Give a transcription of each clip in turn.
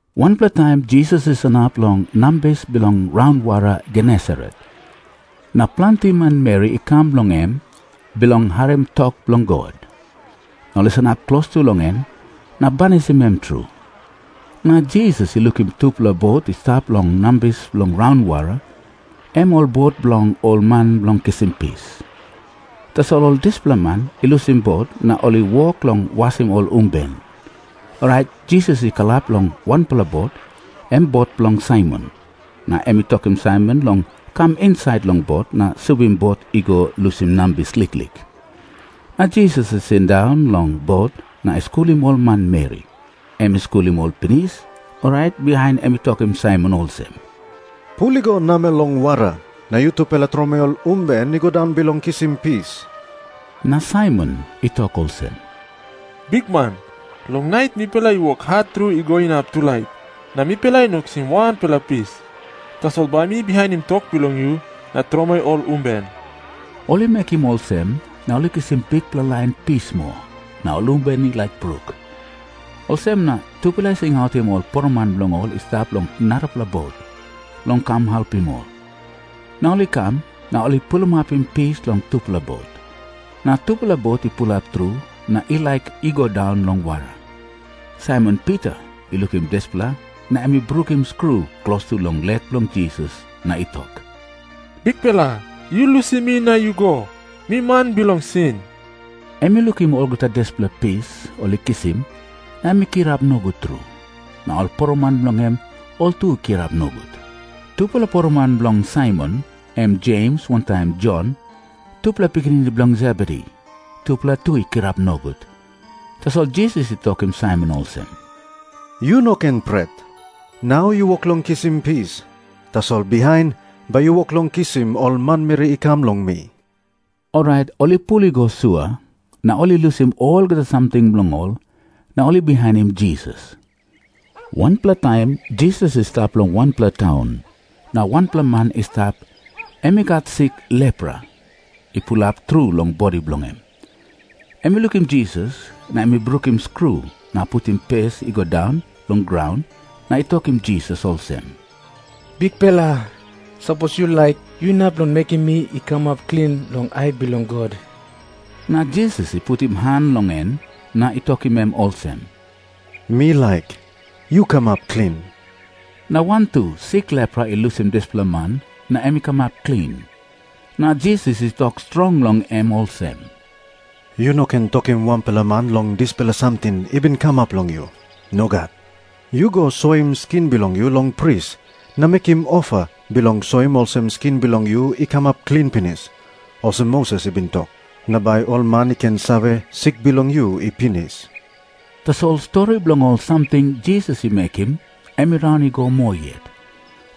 Wanpela taim Jisas i sanap long nambis bilong raunwara Genesaret, na planti manmeri i kam long em bilong harim tok bilong God, na ol i sanap klostu long em na banisim em tru. Na Jisas i lukim tupela bot i stap long nambis bilong raunwara, em ol bot bilong ol man bilong kisim pis. Tasol ol dispela man i lusim bot, na ol i wok long wasim ol umben. Orait Jisas i kalap long wanpela bot, em bot bilong Saimon. Na em i tokim Saimon long kam insait long bot na subim bot i go lusim nambis liklik. Na Jisas i sindaun long bot na i skulim ol manmeri. Em i skulim ol pinis, orait bihain em i tokim Saimon olsem, “Pul i go namel long wara, na tromoi ol umben i go daun bilong kisim pis.” Na Saimon i tok olsem, “Bikman, long nait mipela i wok hat tru i go inap tulait, na mipela i no kisim wanpela pis. Tasol bai mi bihainim tok bilong yu na tromoi ol umben.” Ol i mekim olsem, na ol i kisim bikpela lain pis moa, na ol umben i laik bruk. Olsem na ol i singautim ol poroman bilong ol i stap long narapela bot, long kam helpim ol. Na ol i kam, na ol i pulimapim pis long tupela bot. Na tupela bot i pulap tru na i laik i go daun long wara. Saimon Pita i lukim dispela, na em i brukim skru klostu long lek bilong Jisas na i tok, “Bikpela, yu lusim mi na yu go. Mi man bilong sin.” Em i lukim olgeta dispela pis ol i kisim, na em i kirap nogut tru. Na ol poroman bilong en, ol tu i kirap nogut. Tupela poroman bilong Saimon, em Jems wantaim Jon, tupela pikinini bilong Sebedi, tupela tu i kirap nogut. Tasol Jisas i tokim Saimon olsem, “Yu no ken pret. Nau yu wok long kisim pis, tasol bihain bai yu wok long kisim ol manmeri i kam long mi.” Orait ol i pul i go sua, na ol i lusim olgeta samting bilong ol, na ol i bihainim Jisas. Wanpela taim Jisas i stap long wanpela taun, na wanpela man i stap, em i gat sik lepra i pulap tru long bodi bilong em. Em i lukim Jisas, na em i brukim skru na putim pes i go daun long graun na i tokim Jisas olsem, “Bikpela, sapos yu laik, yu inap long mekim mi i kamap klin long ai bilong God.” Na Jisas i putim han long em na i tokim em olsem, “Mi laik. Yu kamap klin.” Na wantu sik lepra i lusim dispela man, na em i kamap klin. Na Jisas i tok strong long em olsem, “Yu no ken tokim wanpela man long dispela samting i bin kamap long yu. Nogat. Yu go soim skin bilong yu long pris, na mekim ofa bilong soim olsem skin bilong yu i kamap klin pinis, olsem Moses i bin tok. Na bai ol man i ken save, sik bilong yu i pinis.” Tasol stori bilong ol samting Jisas i mekim em i raun i go moa yet.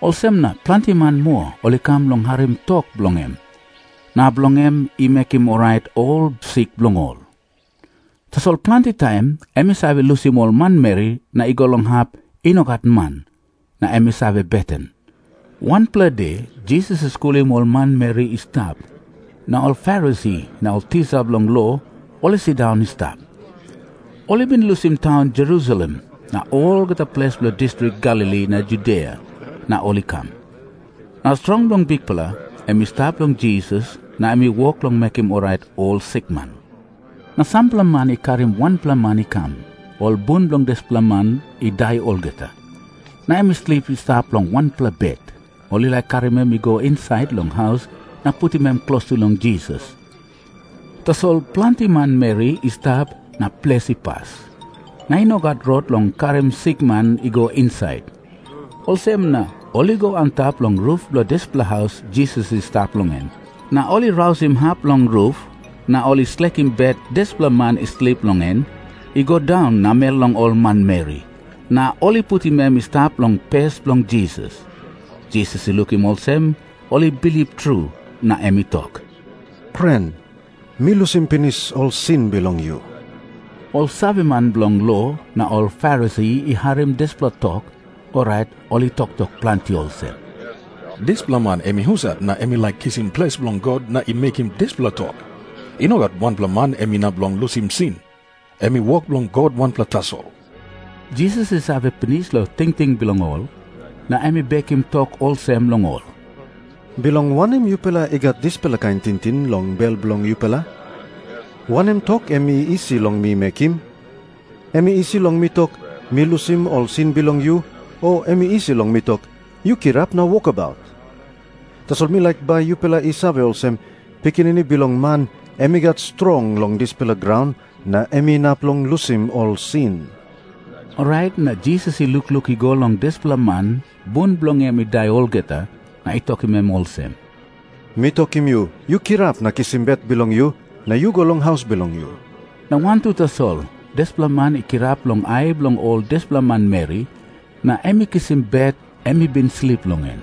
Olsem na planti man moa ol i kam bilong harim tok bilong em, na bilong em i mekim orait ol sik bilong ol. Tasol planti taim em i save lusim ol manmeri na i go long hap i no gat man, na em i save beten. Wanpela de Jisas i skulim ol manmeri i stap, na ol Farisi na ol tisa bilong lo ol i sindaun i stap. Ol i bin lusim taun Jerusalem na olgeta ples bilong distrik Galili na Judia na ol i kam. Na strong bilong Bikpela em i stap long Jisas na em i wok long mekim orait ol sikman. Na sampela man i karim wanpela man i kam. Ol bun bilong dispela man i dai olgeta, na em i slip i stap long wanpela bet. Ol i laik karim em i go insait long haus na putim em klostu long Jisas, tasol planti manmeri i stap na ples i pas, na i no gat rot bilong karim sikman i go insait. Olsem na ol i go antap long rup bilong dispela haus Jisas i stap long en. Na ol i rausim hap bilong rup, na ol i slekim bet dispela man i slip long en i go daun namel long ol manmeri, na ol i putim em i stap long pes bilong Jisas. Jisas i lukim olsem ol i bilip tru, na em i tok, “Pren, mi lusim pinis ol sin bilong yu.” Ol saveman bilong lo na ol Farisi i harim dispela tok, orait ol i toktok planti olsem, “Dispela man em i husat na em i laik kisim ples bilong God na i mekim dispela tok? I no gat wanpela man em inap long lusim sin. Em i wok bilong God wanpela tasol.” Jisas i save pinis long tingting bilong ol, na em i bekim tok olsem long ol, “Bilong wanem yupela i gat dispela kain tingting long bel bilong yupela? Wanem tok em i isi long mi mekim? Em i isi long mi tok, ‘Mi lusim ol sin bilong yu,’ o em i isi long mi tok, ‘Yu kirap na wokabaut’? Tasol mi laik bai yupela i save olsem, Pikinini Bilong Man em i gat strong long dispela graun, na em inap long lusim ol sin.” Orait na Jisas i lukluk i go long dispela man bun bilong en i dai olgeta na i tokim em olsem, “Mi tokim yu, yu kirap na kisim bet bilong yu, na yu go long haus bilong yu.” Na wantu tasol dispela man i kirap long ai bilong ol dispela manmeri, na em i kisim bet em i bin slip long en.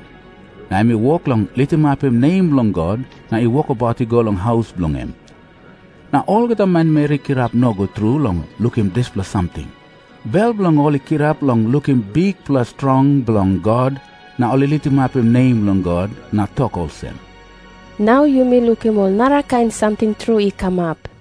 Na em i wok long litimapim nem bilong God na i wokabaut i go long haus bilong en. Na olgeta manmeri i kirap nogut tru long lukim dispela samting. Bel bilong ol i kirap long lukim bikpela strong bilong God na ol i litimapim nem bilong God na tok olsem, “Nau yumi lukim ol narakain samting tru i kamap.”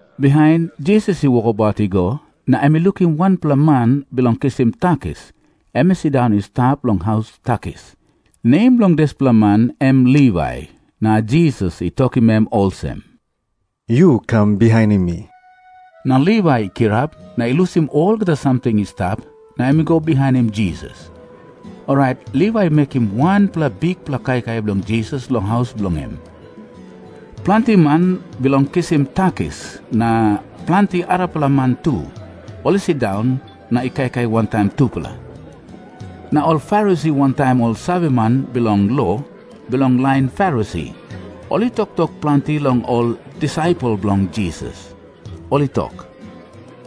Bihain Jisas i wokabaut i go na em i lukim wanpela man bilong kisim takis em i sindaun i stap long haus takis. Nem bilong dispela man em Livai. Na Jisas i tokim em olsem, “Yu kam bihainim mi.” Na Livai i kirap na i lusim olgeta samting i stap, na em i go bihainim Jisas. Orait Livai i mekim wanpela bikpela kaikai bilong Jisas long haus bilong em. Planti man bilong kisim takis, na planti arapela man tu, ol i sindaun na i kaikai wantaim tupela. Na ol Farisi wantaim ol saveman bilong lo bilong lain Farisi ol i toktok planti long ol disaipel bilong Jisas. Ol i tok,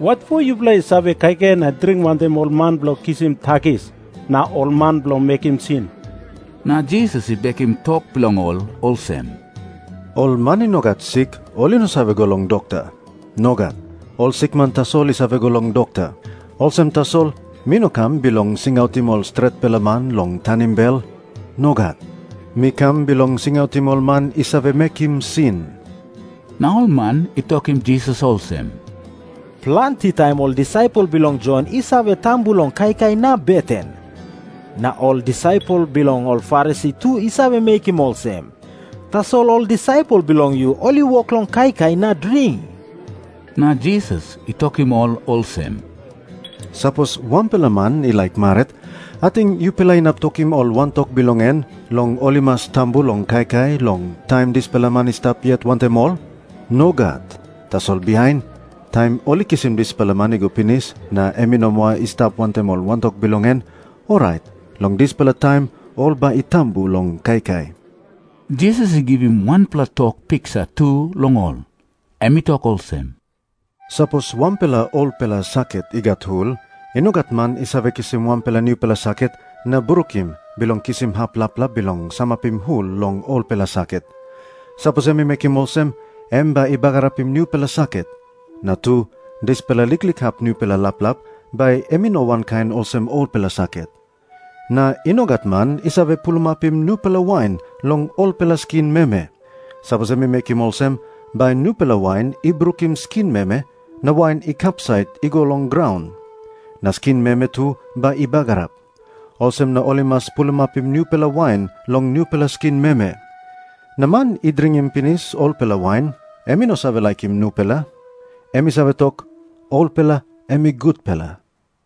“Watpo yupela i save kaikai na dring wantaim ol man bilong kisim takis na ol man bilong mekim sin?” Na Jisas i bekim tok bilong ol olsem, “Ol man i no gat sik ol i no save go long dokta. Nogat. Ol sikman tasol i save go long dokta. Olsem tasol, mi no kam bilong singautim ol stretpela man long tanim bel. Nogat. Mi kam bilong singautim ol man i save mekim sin.” Na ol man i tokim Jisas olsem, “Planti taim ol disaipel bilong Jon i save tambu long kaikai na beten. Na ol disaipel bilong ol Farisi tu i save mekim olsem. Tasol ol disaipel bilong yu ol i wok long kaikai na dring.” Na Jisas i tokim ol olsem, “Sapos wanpela man i laik marit, ating yupela inap tokim ol wantok bilong en long ol i mas tambu long kaikai long taim dispela man i stap yet wantaim ol? Nogat. Tasol bihain, taim ol i kisim dispela man i go pinis na em i no moa i stap wantaim ol wantok bilong en, orait long dispela taim ol bai i tambu long kaikai.” Jisas i givim wanpela tok piksa tu long ol. Em i tok olsem, “Sapos wanpela olpela saket i gat hul, i no gat man i save kisim wanpela nupela saket na brukim bilong kisim hap laplap bilong samapim hul long olpela saket. Sapos em i mekim olsem, em bai i bagarapim nupela saket, na tu dispela liklik hap nupela laplap bai em i no wankain olsem olpela saket. Na i no gat man i save pulimapim nupela wain long olpela skin meme. Sapos em i mekim olsem, bai nupela wain i brukim skin meme na wain i kapsait i go long graun. Na skin meme tu bai i bagarap. Olsem na ol i mas pulimapim nupela wain long nupela skin meme. Na man i dringim pinis olpela wain, em i no save laikim nupela. Em i save tok, ‘Olpela em i gutpela.’”